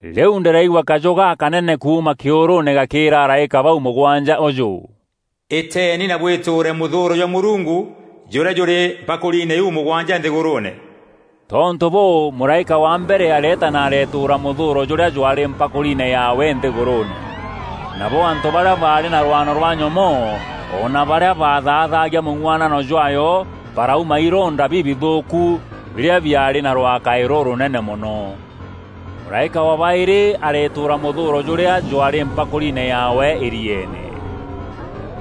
Rîu ndîraigua kajû gakanene kuuma kîûrûûne gakîîraga araîka bau mûgwanja ûjû, “Îteeni na bwîtûûre mûthûûro jwa Mûrungu jûrîa jûrî mpakûriine iu mûgwanja nthîgûrûûne.” Tontû bûû mûraîka wa mbere areeta na aretûûra mûthûûro jûrîa jwaarî mpakûriine yaawe nthîgûrûûne. Nabo antû barîa baarî na rwano rwa nyomoo o na barîa bathaathagia mûng'uanano jwaayo barauma ironda bibithûûku birîa biaarî na rwakaî rûrûnene mono. Mûraîka wa baîrî aretûûra mûthûûro jûrîa jwaarî mpakûriine yaawe îrieene.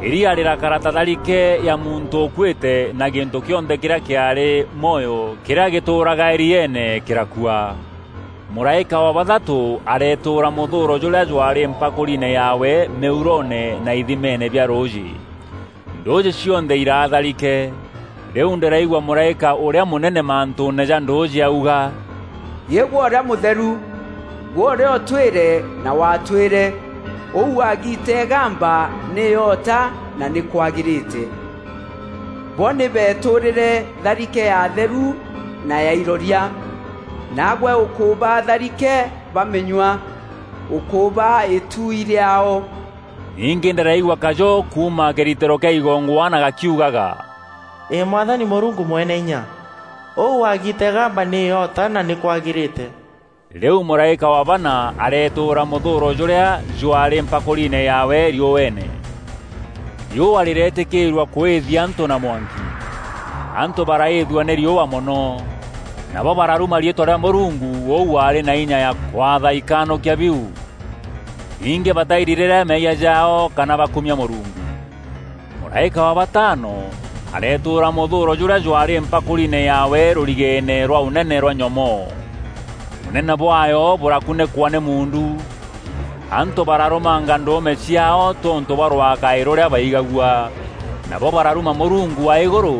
Îria rîrakara ta tharike ya muntû ûkuîte na gîntû kîonthe kîrîa kîaarî mwoyo kîrîa gîtûûraga îrieene kîrakua. Mûraîka wa bathatû aretûûra mûthûûro jûrîa jwaarî mpakûriine yaawe mîuroone na ithimeene bia rûûjî. Ndûûjî cionthe iraa tharike. Rîu ndîraigua mûraîka ûrîa mûnene mantûûne ja ndûûjî auga, “Îgwe ûrîa Mûtheru, gwe ûrîa ûtwîre na watwîre! Ûu wagiita îgamba nî îota na nî kwagîrîte. Bo nî beetûrîre tharike ya atheru na ya iroria, naagwe ûkûbaa tharike bamînyua. Ûkûbaa îtui rîaao!” Ningî ndîraigua kajû kuuma kîritîro kîa igongwana gakiugaga, “Îî Mwathani Mûrungu Mweneinya! Ûu wagiita îgamba nî îota na nî kwagîrîte!” Rîu mûraîka wa bana aretûûra mûthûûro jûrîa jwaarî mpakûriine yaawe riûeene. Riûa rîreetîkîîrua kûîthia antû na mwanki. Antû baraîîthua nî riûa mono, nabo bararuma riîtwa rîa Mûrungu ûu waarî na inya ya kwatha ikanûkia biu. Ningî batairirîre meeyia jaao kana bakumia Mûrungu. Mûraîka wa batano aretûûra mûthûûro jûrîa jwaarî mpakûriine yaawe rûrigeene rwa ûnene rwa nyomoo. Ûnene bwaayo bûrakunîkwa nî muundu. Antû bararûmanga ndûûme ciaao tontû bwa rwakaî rûrîa baigagua. Nabo bararuma Mûrungu wa îgûrû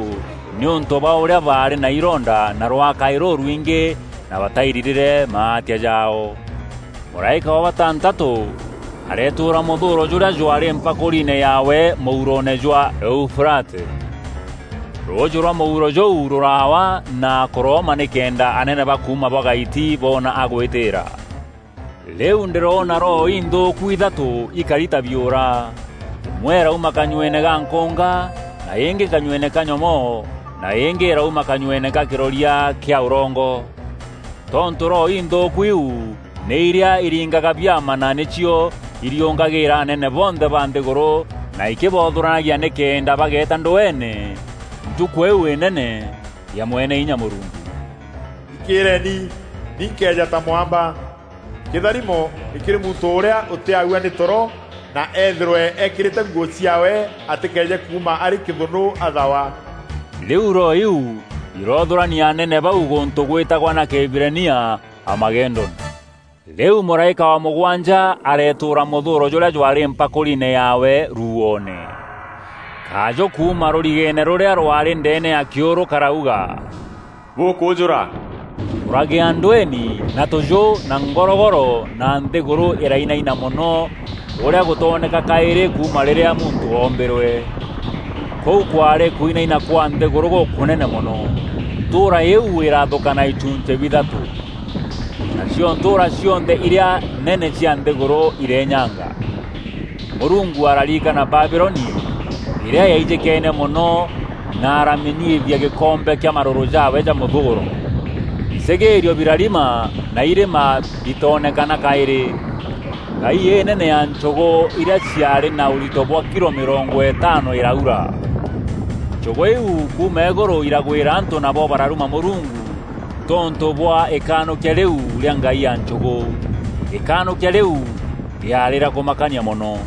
nîûntû bwa ûrîa baarî na ironda na rwakaî rûrwingî na batairirîre maatia jaao. Mûraîka wa batantatû aretûûra mûthûûro jûrîa jwaarî mpakûriine yaawe mûuroone jwa Eufurate. Rûûjî rwa mûuro jûu rûraawa na kûrooma nîkenda anene ba kuuma bwa gaiti boona agwîtîîra. Rîu ndîroona roho inthûûku ithatû ikari ta biûra: îmwe îrauma kanyueene ga nkûnga na îngî kanyueene ka nyomoo na îngî îraûma kanyueene ka kîroria kîa ûrongo. Tontû roho inthûûku iu nî irîa iringaga biama na nîcio iriûngagîra anene bonthe ba nthîgûrû na ikîbothûranagia nîkenda bageeta ndweene Ntukû îîu înene ya Mweneinya Mûrungu. “Thikîîreni, ni nkeeja ta mwamba! Kîtharimo nî kîrî muntû ûrîa ûtîaua nî toro na ethîrwe ekîrîte nguû ciaawe atîkeeje kuuma arî kîthûnû athawa!” Rîu roho iu iroothûrania anene bau gûntû gweetagwa na Kîhibirania Amagedoni. Rîu mûraîka wa mûgwanja aretûûra mûthûûro jûrîa jwaarî mpakûriine yaawe ruuoone. Kajû kuuma rûrigeene rûrîa rwaarî ndeene ya kîûrû karauga, “Bûkûûjûra!” Kûragîa ndweeni na tûjû na ngorogoro na nthîgûrû îrainaina mono ûrîa gûtooneka kaîrî kuuma rîrîa muntû oombîrwe! Kûu kwaarî kwinaina kwa nthîgûrû gûkûnene mono! Ntûûra iu îraathûkana ichunchî bithatû. Nacio ntûûra cionthe irîa nene cia nthîgûrû ireenyanga. Mûrungu araririkana Babiloni îrîa yaijîkeene mono na aramînyuithia gîkombe kîa marûrû jaawe ja mûthûûro. Icîgîîrio birarima na irîma bitoonekana kaîrî. Ngai înene ya nchûgû irîa ciaarî na ûrito bwa kilo mîrongo îtaano îraura. Nchûgû iu kuuma îgûrû iragwîra antû nabo bararuma Mûrungu tontû bwa ikanûkia rîu rîa ngai ya nchûgû. Îkanûkia rîu rîaarî rîa kûmakania mono.